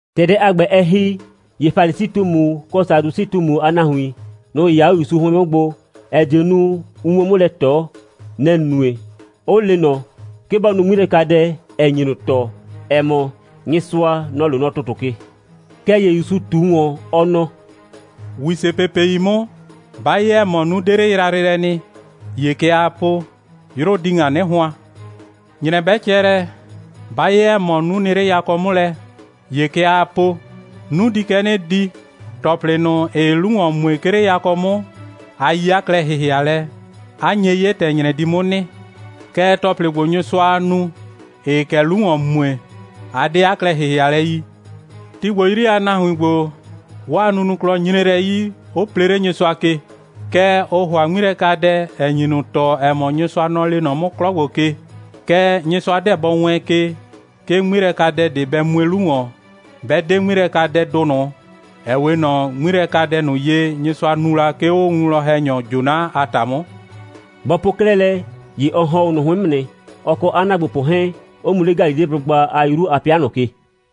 ‑Tɛ dɛ a ‑gbɛ, ɛ ‑hi, ‑ye Falisi꞊tumu kɔ Sadusɩ꞊tumu a nahuin, nʋ‑ 'yɩya 'o ‑Yusu 'hʋɩn 'mʋ gbo, ‑ɛ die nu, ʋ 'muo 'mʋ lɛ ꞊tɔ. Nɛ‑ nue, 'ʋ le ꞊nɔ, 'ke bɔ nu 'ŋmilɛkadɛ, ‑ɛ nyi ꞊nʋ tɔɔ, ‑ɛ mɔ, Nyɩsʋa, nɔ‑ loo nɔ ‑tʋtʋ ke. Kɛɛ ‑ye ‑Yusu ꞊tu ‑wɔn, ɔ nɔ: «‑Wisepepei 'mʋ, 'ba 'ye, ‑ɛ mɔ, 'nu 'de 'le yrayrɩ lɛ nɩ, ‑ye kɛ aa po: 'Yrʋ di ‑ŋa 'nɩ hʋan. ‑Nyrɛ 'bɛ cɛ lɛ, 'ba 'ye, ‑ɛ mɔ, 'nu nɩ 'le yakɔ 'mʋ lɛ, ‑ye kɛ aa po: 'Nu di kɛ 'nɩ di. ‑Tɔplɩ ꞊nʋ, ‑ɩɩ 'lu ‑wɔn mue, 'ke 'le yakɔ 'mʋ, a yi 'a klɛ‑hɩhɩalɛ, 'a nye 'ye, ‑tɛ ‑nyrɛ di 'mʋ nɩ. Kɛɛ, ‑tɔplɩ ‑gbo, Nyɩsʋaa nu, ‑ɩɩ kɛ 'lu ‑wɔn mue, a 'de 'a klɛ‑hɩhɩalɛ yi. Ti ‑gbo 'yri a nahuin ‑gbo, 'waa nunuklɔ nyre lɛ 'yi, 'ʋ plee 'le Nyɩsʋa ke. Kɛɛ, ʋʋ ‑hʋa 'ŋmilɛkadɛ, ‑ɛ nyi ꞊nʋ tɔɔ, ‑ɛ mɔ, Nyɩsʋa, nɔ‑ lee nɔ 'mʋ 'klɔ ‑gbo ke. Kɛɛ, Nyɩsʋa 'deɛ bɔ wɛɛn ke, 'ke 'ŋmilɛkadɛ ꞊de bɛ mue 'lu ‑wɔn, 'bɛ 'de 'ŋmilɛkadɛdʋ ꞊nʋ, ‑ɛ 'we ꞊nɔ 'ŋmilɛkadɛ ꞊nʋ ye, Nyɩsʋa nu la, 'ke 'o 'a winwlɔn‑hɛnyɔ Jona a ‑ta 'mʋ.» Bɔ po 'klɛɛ lɛ, ‑ye ɔ ‑hɔn 'o ꞊nʋ 'hʋɩn 'mʋ nɩ, ɔ kɔ 'a ‑naagbopʋ 'hɛɛn, 'ʋ mu 'le Galileblʋgba a 'yru a 'pɩa ꞊nʋ ke.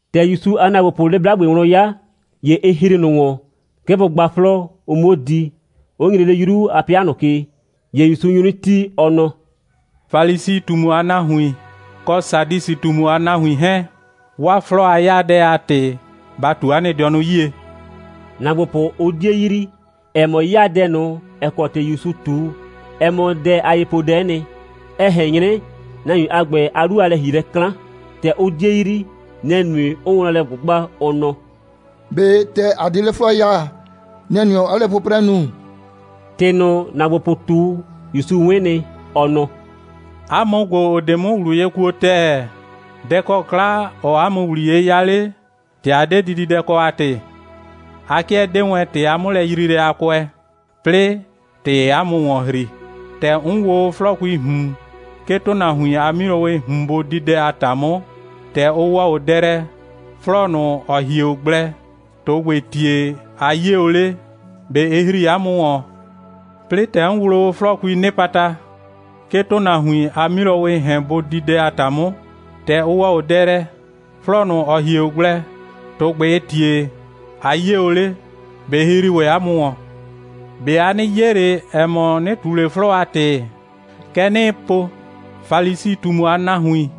‑Tɛ ‑Yusu a ‑naagbopʋʋ 'le 'blagbe wlɔn 'ya, ‑ye ɩ ‑hri ꞊nʋ ‑wɔn, 'ke bʋ gba 'flɔɔ, ʋ 'muo di, 'ʋ nyre 'le 'yru a 'pɩa ꞊nʋ ke. ‑Ye ‑Yusu nyu 'nɩ tii, ɔ nɔ: «Falisi꞊tumu a nahuin, kɔ Sadusɩ꞊tumu a nahuin 'hɛɛn, 'waa 'flɔɔ a 'yaadɛ a ‑tɩ, ba ꞊tu 'a nɩ dɩɔnʋ 'yie!» ‑Naagbopʋ, ʋ 'die yrii, ‑ɛ mɔ, 'yaadɛ ꞊nʋ, ‑ɛ kɔ ‑tɩ ‑Yusu ꞊tu, ɛ mɔ dɛ a yepoodɛ'ɛ nɩ, ‑ɛ ꞊hɛn 'nyrɛ nahuin a ‑gbɛ a 'lu a lɛ‑hielɛ 'klan. ‑Tɛ ʋ 'die yrii, nɛ‑ nue, 'ʋʋ wlɔn lɛ ꞊gbʋgba, ʋ nɔ: «꞊Be ‑tɛ ‑a 'de 'le 'flɔɔ ya, nɛ‑ nue, 'ɔɔ lɛ 'pʋprɛ nu?» ‑Tɩ ꞊nʋ, ‑naagbopʋ ꞊tu, ‑Yusu 'wɩn nɩ, ɔ nɔ: «'A mʋ ‑gbo, ‑ʋ 'de 'mʋ ꞊wlʋ ye kuo ‑tɛɛ, dɛ‑ kɔ 'kla, ɔɔ 'a mʋ ‑wliye 'ya 'le, ‑tɛ ‑a 'de kɛ dididɛ kɔ a ‑tɩ? A 'kɩɛ 'dee wɛn ‑tɩ a 'mʋlɛyriilɛ a kʋɛ, 'plɩɩ, ‑tɩɩ 'a mʋ ‑wɔn ‑hri. ‑Tɛ 'n wloo o 'flɔɔkuii ꞊hun, 'ke ‑tʋnahuin a 'milowɩɩ ꞊hun bʋ di dɛ a ‑ta 'mʋ, ‑tɛ ʋ ‑wɔ o dɛ lɛ, 'flɔɔ ꞊nʋ, ‑ɔ hie o gblɛ, ‑tʋgbɩɩ ‑tie a 'yie o 'le? ꞊Be ɩ ‑hri 'a mʋ ‑wɔn? 'Plɩɩ, ‑tɛ 'n wloo o 'flɔɔkuii 'nɩpata, 'ke ‑tʋnahuin a 'milowɩɩ ‑hɛn bʋ di dɛ a ‑ta 'mʋ, ‑tɛ ʋ ‑wɔ o dɛ lɛ, 'flɔɔ ꞊nʋ, ‑ɔ hie o gblɛ, ‑tʋgbɩɩ ‑tie a 'yie o 'le? ꞊Be ɩ ‑hri ‑wɛ 'a mʋ ‑wɔn? ꞊Be a 'nɩ 'ye ꞊le, ‑ɛ mɔ, 'nɩ ꞊tu ꞊le 'flɔɔ a ‑tɩ? Kɛ 'nɩɩ po: Falisi꞊tumu a nahuin,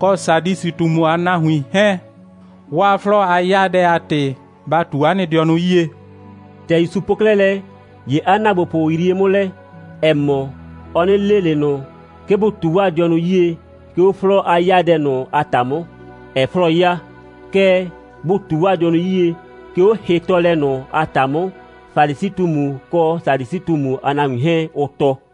kɔ Sadusɩ꞊tumu a nahuin 'hɛɛn, 'waa 'flɔɔ a 'yaadɛ a ‑tɩ, ba ꞊tu 'a nɩ dɩɔnʋ 'yie!» ‑Tɛ ‑Yusu po 'klɛɛ lɛ, ‑ye 'a ‑naagbopʋ yrie 'mʋ lɛ, ‑ɛ mɔ, ɔ 'nɩ le ꞊le ꞊nʋ, 'ke bʋ ꞊tu 'waa dɩɔnʋ 'yie, 'ke 'o 'flɔɔ a 'yaadɛ ꞊nʋ a ‑ta 'mʋ, ‑ɛɛ 'flɔɔ 'yaa, kɛɛ, bʋ ꞊tu 'waa dɩɔnʋ 'yie, 'ke 'o hɩtɔɔlɛ ꞊nʋ a ‑ta 'mʋ, Falisi꞊tumu kɔ Sadusɩ꞊tumu a nahuin 'hɛɛn, ʋʋ tɔɔ.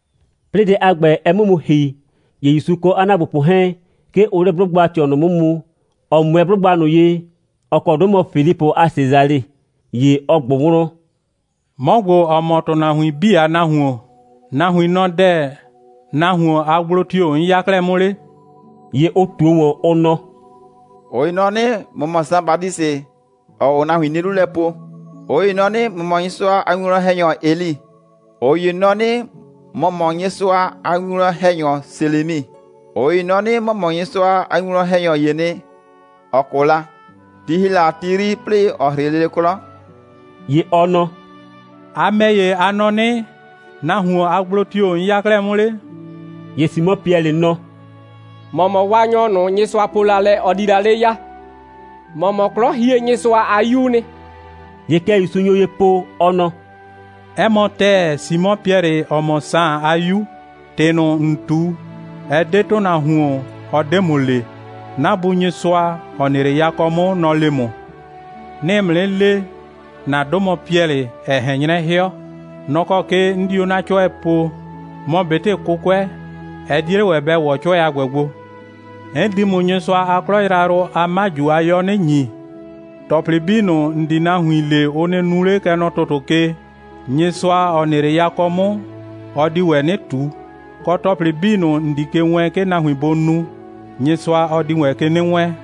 'Plɩɩ dɛ a ‑gbɛ, ɛ 'mʋ mu ‑hi, ‑ye ‑Yusu kɔ 'a ‑naagbopʋ 'hɛɛn, 'ke ʋʋ 'le 'blʋgba꞊tɩɔ ꞊nʋ 'mʋ mu, ‑ɔ 'mʋɛɛ 'blʋgba ꞊nʋ ye, ‑ɔ kɔ 'dʋ mɔ Filipʋ a Sesale. ‑Ye ɔ ꞊gbʋ wlɔn: «'Mɔ ‑gbo, ‑ɔ mɔ ‑tʋnahuin 'bii a Nahuon, nahuin nɔ dɛ‑, nahuon a gblo tio‑ 'n 'ya 'klɛɛ 'mʋ 'le?» ‑Ye ʋ ꞊tuo ꞊wɔn, ʋ nɔ: «꞊Ʋ ‑ye nɔ 'nɩ, ‑mɔ mɔ Saan Batisɩ, ‑ɔɔ o nahuin 'nie 'lu lɛ po. ꞊Ʋ ‑ye nɔ 'nɩ, ‑mɔ mɔ Nyɩsʋa a winwlɔn‑hɛnyɔ Eli. ꞊Ʋ ‑ye nɔ 'nɩ, ‑mɔ mɔ Nyɩsʋa a winwlɔn‑hɛnyɔ Selemi. ꞊Ʋ ‑ye nɔ 'nɩ, ‑mɔ mɔ Nyɩsʋa a winwlɔn‑hɛnyɔ ‑yee nɩ, ‑ɔ 'kʋ la, ti ‑hi la a ti 'yri, 'plɩɩ ‑ɔ 'hrɩ lele 'klɔ.» ‑Ye ɔ nɔ: «A ‑mɛ ‑ye, a nɔ 'nɩ, nahuon a gblo tio‑ 'n 'ya 'klɛɛ 'mʋ 'le?» ‑Ye Simɔ Piɛlɩ nɔ: «‑Mɔ mɔ Waanyɔ ꞊nʋ, Nyɩsʋa po la lɛ, ɔ di la 'le ya. ‑Mɔ mɔ 'Klɔhienyɩsʋa a 'Yuu nɩ.» ‑Ye kɛ ‑Yusu nyo ye po, ɔ nɔ: «'Ɛ mɔ ‑tɛɛ, Simɔ Piɛlɩ, ‑ɔ mɔ Saan a 'yu. ‑Tɩ ꞊nʋ, ‑n ꞊tu, ɛ 'de ‑tʋnahuon, ɔ 'de ‑mʋ le. 'Na Bu Nyɩsʋa, ‑ɔ nɩ 'le yakɔ 'mʋ, nɔ‑ le ‑mʋ. 'Nɩɩ ‑mʋ 'nɩ le, ‑na 'dʋ mɔ Piɛlɩ, ‑ɛ ꞊hɛn 'nyrɛ 'hɩɔ. Nɔ‑ kɔ ke 'n di 'o 'na 'cʋɛ poo. Mɔ ꞊betɩ 'kʋkʋɛ, ɛ 'die 'le ‑wɛ bɛ ‑wɔ 'cʋɛ a ‑gbɛ gbo. 'N di ‑mʋ Nyɩsʋa a 'klɔ yrayrʋ a 'maju a 'yɔ 'nɩ ‑nyi. ‑Tɔplɩ 'bii ꞊nʋ, ‑n di nahuin le, ʋ nɩ nu 'le, kɛ nɔ ‑tʋtʋ ke, Nyɩsʋa, ‑ɔ nɩ 'le yakɔ 'mʋ, ɔ di ‑wɛ 'nɩ ꞊tu. Kɔ, ‑tɔplɩ 'bii ꞊nʋ, ‑n di ke wɛɛn, 'ke nahuin bʋ nu, Nyɩsʋa, ɔ di ‑wɛ ke 'nɩ wɛɛn.»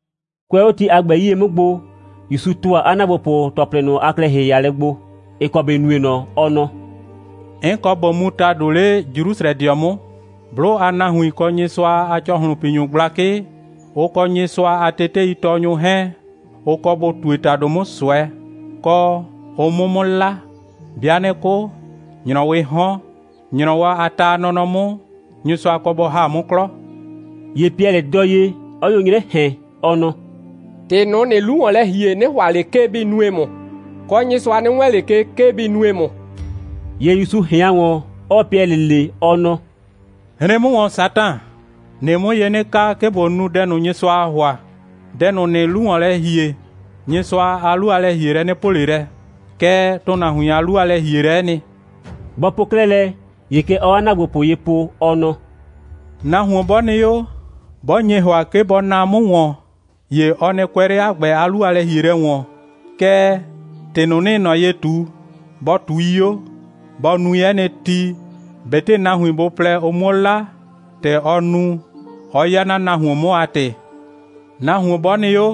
Kʋɛ 'o ti a ‑gbɛ 'yie 'mʋ gbo, ‑Yusu ‑tʋa 'a ‑naagbopʋ ‑tɔplɩ ꞊nʋ a klɛ‑hɩhɩalɛ gbo, ‑ɩ kɔ ‑bɩ nue ꞊nɔ, ɔ nɔ: «'N kɔ ꞊bo mu ‑tado 'le Jrusrɛdɩɔ 'mʋ. 'Blʋ a nahuin, kɔ Nyɩsʋa a ‑cɔhlʋnpinyʋ gblakɩ, ʋ kɔ Nyɩsʋa a teteitɔɔnyʋ 'hɛɛn, ʋ kɔ bʋ ꞊tue ‑tado 'mʋ ꞊sʋɛ, kɔ, ʋ 'mʋ 'mʋ 'la. 'Bɩa 'nɩ 'kʋ, ‑nyrɔwɩɩ 'hɔn, ‑nyrɔwɔ a ta a nɔnɔ 'mʋ, Nyɩsʋa kɔ bɔ ‑ha 'mʋ 'klɔ.» ‑Ye Piɛlɩ dɔɔ ye, 'ɔ nyo 'nyrɛ ꞊hɛn, ɔ nɔ: «‑Tɩ ꞊nʋ, ‑nɩɩ 'lu ‑wɔn lɛ ‑hie, 'nɩ ‑hʋa ꞊le, 'ke bɩ nue ‑mʋ, kɔ, Nyɩsʋa nɩ wɛɛn 'le ke, 'ke bɩ nue ‑mʋ.» ‑Ye ‑Yusu ꞊hɩan ‑wɔn, 'ɔɔ Piɛlɩ le, ɔ nɔ: «Hren 'mʋ ‑wɔn, Satan! ‑Nɩɩ 'mʋ ye 'nɩ ka, 'ke ꞊bo nu dɛ ꞊nʋ, Nyɩsʋaa ‑hʋa. Dɛ ꞊nʋ, ‑nɩɩ 'lu ‑wɔn lɛ ‑hie, Nyɩsʋa a 'lu a lɛ‑hielɛ 'nɩ po ꞊le lɛ, kɛɛ, ‑tʋnahuin a 'lu a lɛ‑hielɛ'ɛ nɩ.» Bɔ po 'klɛɛ lɛ, ‑ye kɛ ɔɔ 'a ‑naagbopʋ ye po, ɔ nɔ: «Nahuon 'bɔ nɩ 'o, 'bɔ nye ‑hʋa, 'ke bɔ naa 'mʋ ‑wɔn, ‑ye ɔ nɩ kʋɛ 'le 'a ‑gbɛ a 'lu a lɛ‑hielɛ ‑wɔn, kɛɛ, ‑tɩ ꞊nʋ, 'nɩɩ ꞊nɔ ye ꞊tu, bɔ ꞊tui 'o, bɔ nui 'ɛ nɩ ti, ꞊betɩ nahuin bʋ plɛ, ʋ 'muo 'la, ‑tɛ ɔ nu, 'ɔ 'ya 'na nahuon 'mʋ a ‑tɩ. Nahuon 'bɔ nɩ 'o,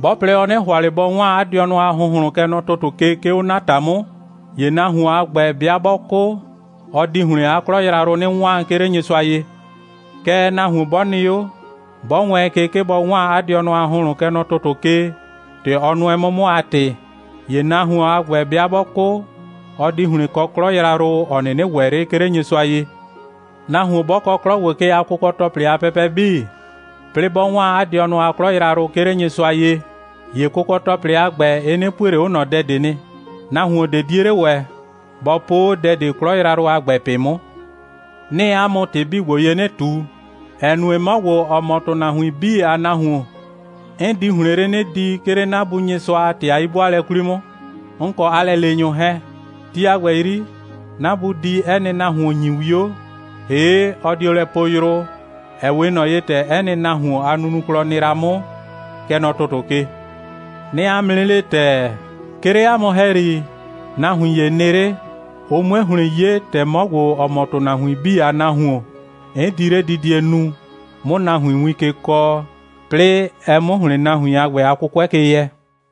'bɔ plɛ, ɔ 'nɩ ‑hʋa ꞊le bɔ 'waan 'a dɩɔnʋ a ‑hʋnhlʋn, kɛ nɔ ‑tʋtʋ ke, 'ke 'o 'na ‑ta 'mʋ, ‑ye nahuon a ‑gbɛ 'bɩa 'bɔ 'kʋ, ɔ di ‑hlɩn 'a 'klɔ yrayrʋ 'nɩ 'waan, 'ke 'le Nyɩsʋa ye. Kɛɛ, nahuon 'bɔ nɩ 'o, 'bɔ wɛɛn ke, 'ke bɔ 'waan 'a dɩɔnʋ a ‑hʋnhlʋn, kɛ nɔ ‑tʋtʋ ke, ‑tɛ ɔ nʋɛ 'mʋ 'mʋ a ‑tɩ, ‑ye nahuon a ‑gbɛ, 'bɩa 'bɔ 'kʋ, ɔ di ‑hlɩn kɔ 'klɔ yrayrʋ, ‑ɔ 'nɩnɩ ‑wɛ 'le, 'ke 'le Nyɩsʋa ye. Nahuon 'bɔ kɔ 'klɔ ‑gbo ke a kʋkɔ‑tɔplɩ a pɛpɛ 'bii, 'plɩɩ 'bɔ 'waan 'a dɩɔnʋ a 'klɔ yrayrʋ, 'ke 'le Nyɩsʋa ye, ‑ye kʋkɔ‑tɔplɩ a ‑gbɛ, ɩ 'nɩ pue ꞊le 'o ꞊nɔ dɛ nɩ. Nahuon ꞊de 'die 'le ‑wɛ, bɔ po 'o dɛ ꞊de 'klɔ yrayrʋ a ‑gbɛ ꞊pɩ 'mʋ. 'Nɩɩ 'a mʋ ‑tɩ 'bii ‑gbo ye 'nɩ ꞊tu, ‑ɛ nue, 'mɔ ‑gbo, ‑ɔ mɔ ‑tʋnahuin 'bii a Nahuon, 'n di ‑hlɩn 'le 'nɩ di, 'ke 'le 'na Bu Nyɩsʋa a ‑tɩ a 'yi'bʋaalɛ 'kwli 'mʋ, 'n kɔ 'a lɛleenyʋ 'hɛɛn. Ti a ‑gbɛ 'yri, 'na Bu di 'ɛ nɩ nahuon ‑nyi 'wio, ‑hee' ɔ dio lɛ poo yrʋ, ‑ɛ 'we ꞊nɔ ye, ‑tɛ 'ɛ nɩ nahuon a nunuklɔ nɩ la 'mʋ, kɛ nɔ ‑tʋtʋ ke. 'Nɩɩ 'a mʋ 'nɩ le ‑tɛɛ, 'ke 'le 'a mʋ ‑hɛyri, nahuin ‑ye nɩ 'le, ʋ 'mue ‑hlɩn 'ye, ‑tɛ 'mɔ ‑gbo, ‑ɔ mɔ ‑tʋnahuin 'bii a Nahuon, 'n di 'ledidie nu, 'mʋ nahuin win ke kɔɔ, 'plɩɩ ɛ 'mʋ ‑hlɩn nahuin a ‑gbɛ a 'kʋkʋɛ ke yɛ.»